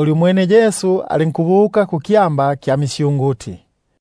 Umwene Yesu yo alinkubuka kukyamba kya misyunguti.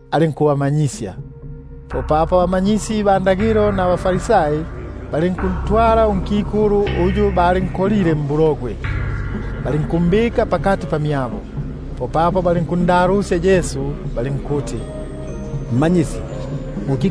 alinkubamanyisya. Popapo abamanyakalata nabaFarisai balinkuntwala unkikulu uyu balinkolile mbulogwe, balinkumbika pakati. Popapo balinkumbula balinkuti: Mmanyisi, unki-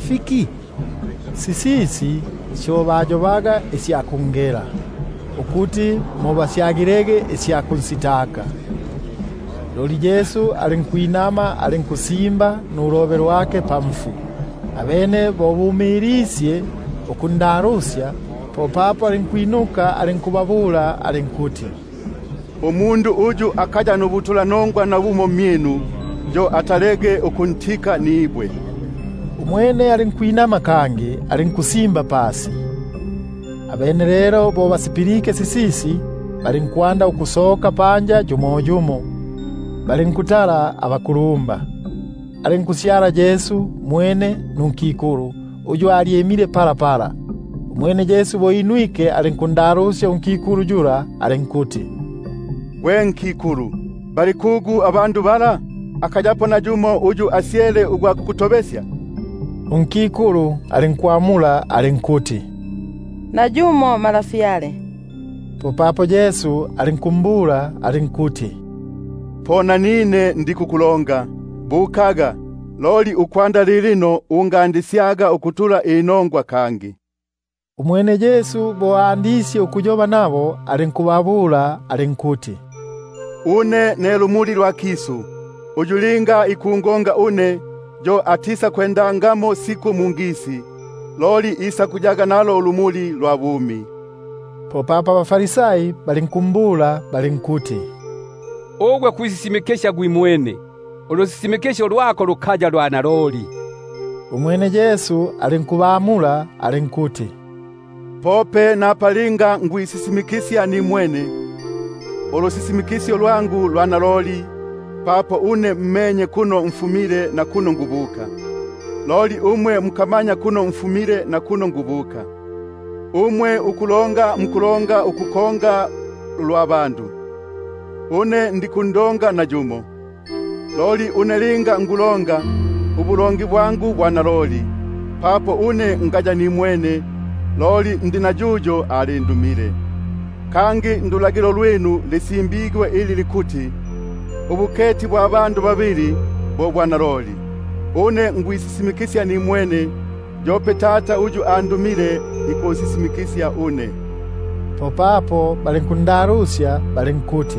fiki? Sisisi syo bayobaga isya kungela, ukuti mo basyagilege isya kumohela. Loli Yesu alinkwinama, alinkusimba nulobe lwake pasi. Abene bo bumilisye ukundalusya, popapo alinkwinuka alinkubabula alinkuti: Uyu akaya nubutulanongwa nabumo mmyinu, yo atalege ukuntika nibwe. Umwene alinkwinama kangi, alinkusimba pasi. Abene lelo bo basipilike sisisi, popapo balinkusoka panja yumo yumo, balinkutala abakulumba; alinkusyala Yesu mwene, nunkikulu uyu alyimile pakati. Umwene Yesu alinkwinuka, alinkundalusya alinkuti: Gwe nkikulu, bali kugu? Nayumo akakuto- besya? Umwene alinkwamula alinkuti: Nayumo Malafyale. Popapo Yesu alinkumbula alinkuti: Po nanine ndikukutobesyaga. Bukaga, loli ukwanda lilino ungatulaga inongwa kangi.] Umwene Yesu alinkwandisya ukuyoba nabo alinkuti: Une ne lumuli lwa kisu; uyu linga ikungonga une, yo atisakwendaga mungisi, himma, isakuyaga nalo ulumuli lwa bumi. Popapo abaFarisai balinkumbula balinkuti: Ugwe kwisisimikisya gwimwene, ulusisimikisyo lwako lukaya lwa naloli. Umwene Yesu alinkubamula alinkuti: Pope napa linga nikwisisimikisya nimwene, ulusisimikisyo lwangu lwa naloli; buno menye kuno mfumile, nakuno nikubuka, loli umwe muka- manya kuno mfumile nakuno nikubuka. Umwe ukulonga mukulonga isya mbili, une ndikundonga nayumo. Loli une linga nikulonga, ubulongi bwangu bwa naloli; buno ngaya nimwene, loli ndi na yuyo alindumile. Kangi ndulagilo lwinu mo lisimbigwe ilya kuti: Ubuketi bwa bandu babili, bo bwa naloli. Une ne nikwisisimikisya nimwene, yope Tata uyu andumile ikusisimikisya une. Popapo balinkundalusya balinkuti: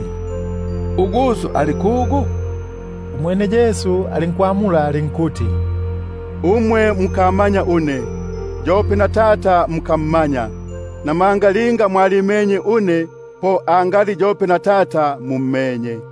Ali ko kugu uGuso? Umwene Yesu alinkwamula alinkuti: Une mukamanya, yope na Tata mukammanya; linga mwalimenye une, po angali yope na Tata mummenye.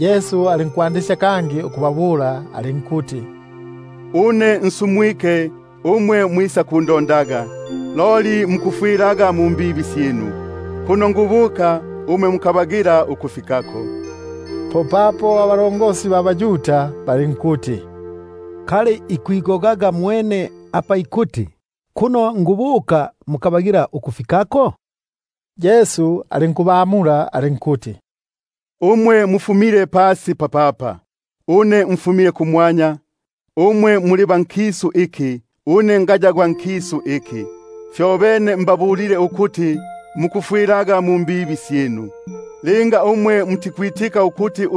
Alinkwandisya kangi ukubabula alinkuti: Une nsumwike, umwe mwisakundondaga, loli mukufwilaga mumbibi syinu; kuno nikubuka mukabagila ukwisako. Popapo abaYuda balinkuti: Kali ikwigogaga mwene, apa ikuti, kuno nikubuka mukabagila ukwisako? Umwene alinkubamula alinkuti: Umwe muli ba pasi, une ndi gwa kumwanya; umwe muli ba nkisu iki, une ngaya gwa nkisu iki. Po apa mbabulile ukuti mukufwilaga mumbibi syinu; papo linga mutikwitika ukuti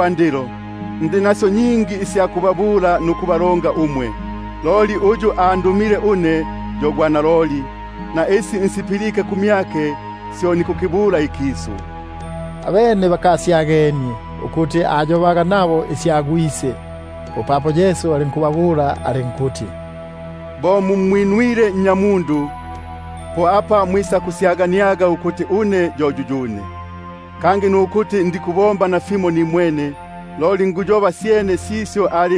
nalilino? Ndi nasyo nyingi isya kubabula nukubalonga umwe; loli uyu andumile yo gwa naloli, na isi nsipilike kumyake syo nikukibula ikisu. Abene bakasyagenie ukuti ayobaga nabo isya Gwise. Popapo Yesu alinkuti: Linga mumwinwile Nnyamundu, po mwisakusyaganiaga ukuti une yo yuyune; kangi nimwene ndikubomba nafimo, loli mumo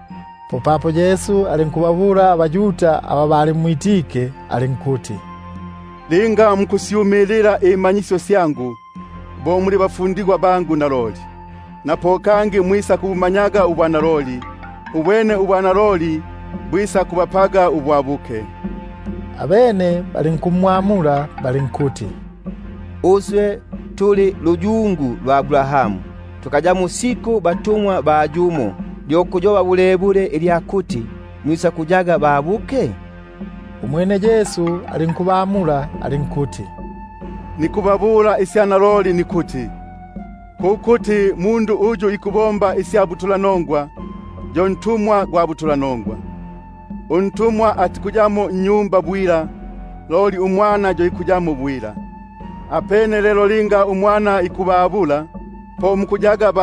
Popapo Yesu alinkubabula abaYuda aba balimwitike alinkuti: Linga mukuya mu mmasyu gangu, bo muli bafu- ndigwa bangu naloli; kangi mwisakubumanyaga ubwanaloli, ubwene ubwanaloli bo bwisakubapelaga babuke. Abene balinkumwamula balinkuti: Uswe tuli luyungu lwa Abrahamu, tukayamo siku batumwa ba yumo; lyo kuyoba bulebule ilyakuti: Mwisakuyaga babuke? Popapo Yesu alinkubamula alinkuti: Naloliloli nikubabula une nikuti: Gwesa uyu ikubomba isya butulanongwa, yo ntumwa gwa butulanongwa. Untumwa atikuyamo nnyumba bwila, loli umwana yo ikuyamo bwila. Apene lelo linga uMwana ikubabula, po mukuyaga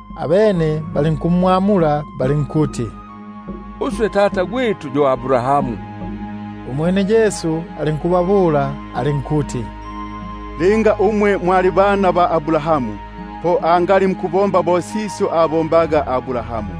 Abene balinkumwamula balinkuti: Uswe tata yo Abrahamu. Umwene Yesu alinkubabula alinkuti: Linga muli bana ba Abrahamu, po mubombege sisyo abombaga Abrahamu.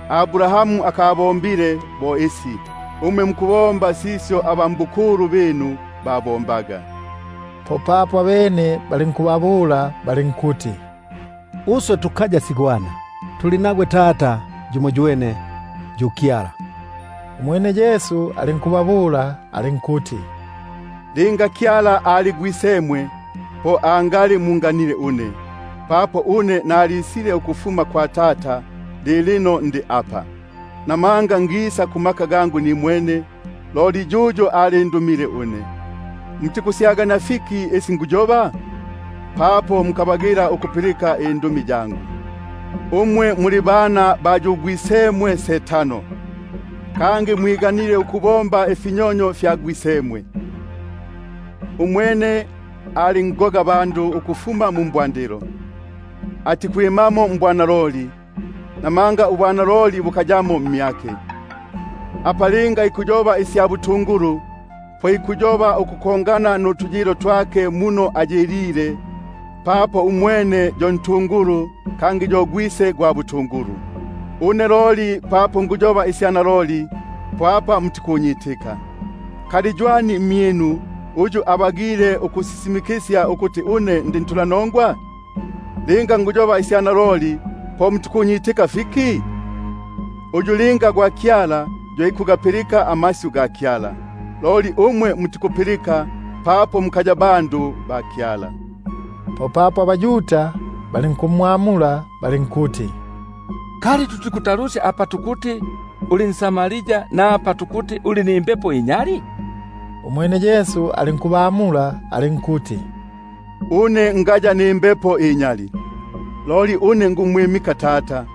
Abrahamu abombile. Umwe mukubomba imbombo sya gwisemwe. Popapo abene balinkuti: Uswe tukaya sigwana; tuli nagwe Tata yumoywene, yu Kyala. Umwene Yesu alinkubabula alinkuti: Linga Kyala ali Gwisemwe, po angali munganile une, papo nisile ukufuma kwa Kyala. Namanga ngisa nimwene, loli yuyo yo alindumile une. Mutikuyagania fiki injobelo yangu? Papo mukamanya ukupilika ilisyu lyangu. Umwe ugwisemwe yo mohesi, kangi ipwiganile ukubomba ifinyonyo fya gwisemwe. Umwene ali ngogabandu ukufuma mu mbwandilo, atikwimamo mbwanaloli, namanga ubwanaloli bukayamo mmyake. Apa linga ikuyoba isya butungulu, po ikuyoba isyake mwene, papo umwene yo ntungulu, kangi yo gwise gwa butungulu. Une loli papo nguyoba isya naloli, mutikunyitika. Kali ywani mmyinu ugwa kunjoba ububibi? Linga nikuyoba isya naloli, po mutikunyitika fiki? Uyu linga afumile kwa Kyala, yo ikugapilika amasyu ga Kyala; fyobene mutikupilika, papo mukafuma kwa Kyala. Popapo abaYuda balinkumwamula balinkuti: Kali tuti-kutalusya apa tukuti uli nSamaria, napa tukuti uli nimbepo inyali? Umwene Yesu alinkubamula alinkuti: Une ngaya nayo imbepo inyali, une nikumwimika yu Tata,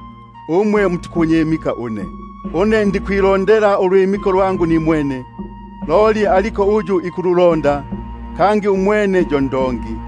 loli umwe mutikunyimika une. Une ndikwilondela ubukulumba nimwene, loli aliko uyu ikubulonda, kangi umwene yo yu ndongi.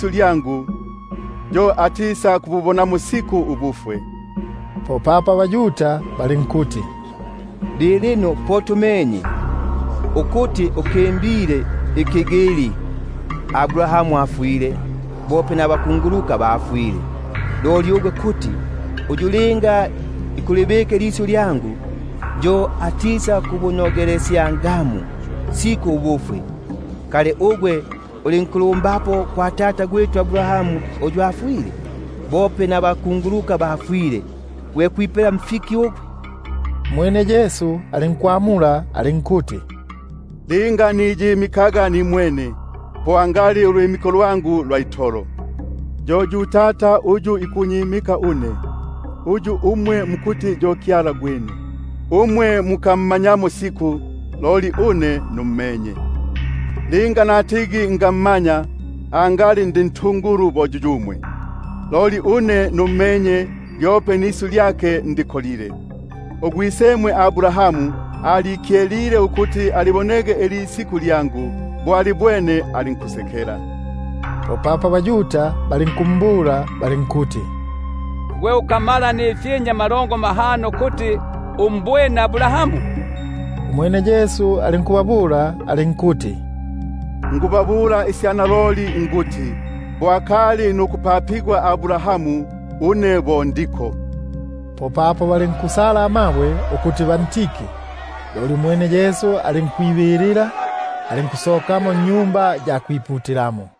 lyangu, yo atisakububonamo siku ubufwe. Popapo abaYuda balinkumbula balinkuti: Lilino po tumenye itolo ukuti uli nimbepo inyali. Abrahamu afwile, bope nabakunguluka bafwile, loli ugwe kuti: Uyu linga ikulibika ilisyu lyangu, yo atisakubunogelesyamo siku ubufwe. Kingamo uli nkulumbapo kwa tata Abrahamu uyu afwile? Bope nabakanguluka bafwile, gwe kwipela mfiki ugwe? Umwene Yesu alinkwamula alinkuti: Linga niyimikaga nimwene, po angali ubukulumba bwangu bwa itolo. Yo yu Tata uyu ikunyimika, uyu umwe mukuti yo Kyala gwitu; napa mukammanyamo, une loli nummenye. Linga natigi ngammanya, angali ndi ntungulu bo yuyumwe. Loli une nummenye, lyope nisyu lyake ndibikile. Umwene Abrahamu ugwisemwe alikyelile ukuli- bona ilisiku lyangu; bo alibwene, alinkusekela. Popapo abaYuda balinkumbula balinkuti: Gwe ukamala ifyinja amalongo mahano kuti numbwene Abrahamu? Umwene Yesu alinkubabula alinkuti: Naloliloli nikubabula une nikuti, bo akali nukupapigwa Abrahamu, une bo ndiko. Popapo balinkusala amabwe ukuti bantike; loli umwene Yesu alinkwibilila, alinkusokamo mwa Tempeli.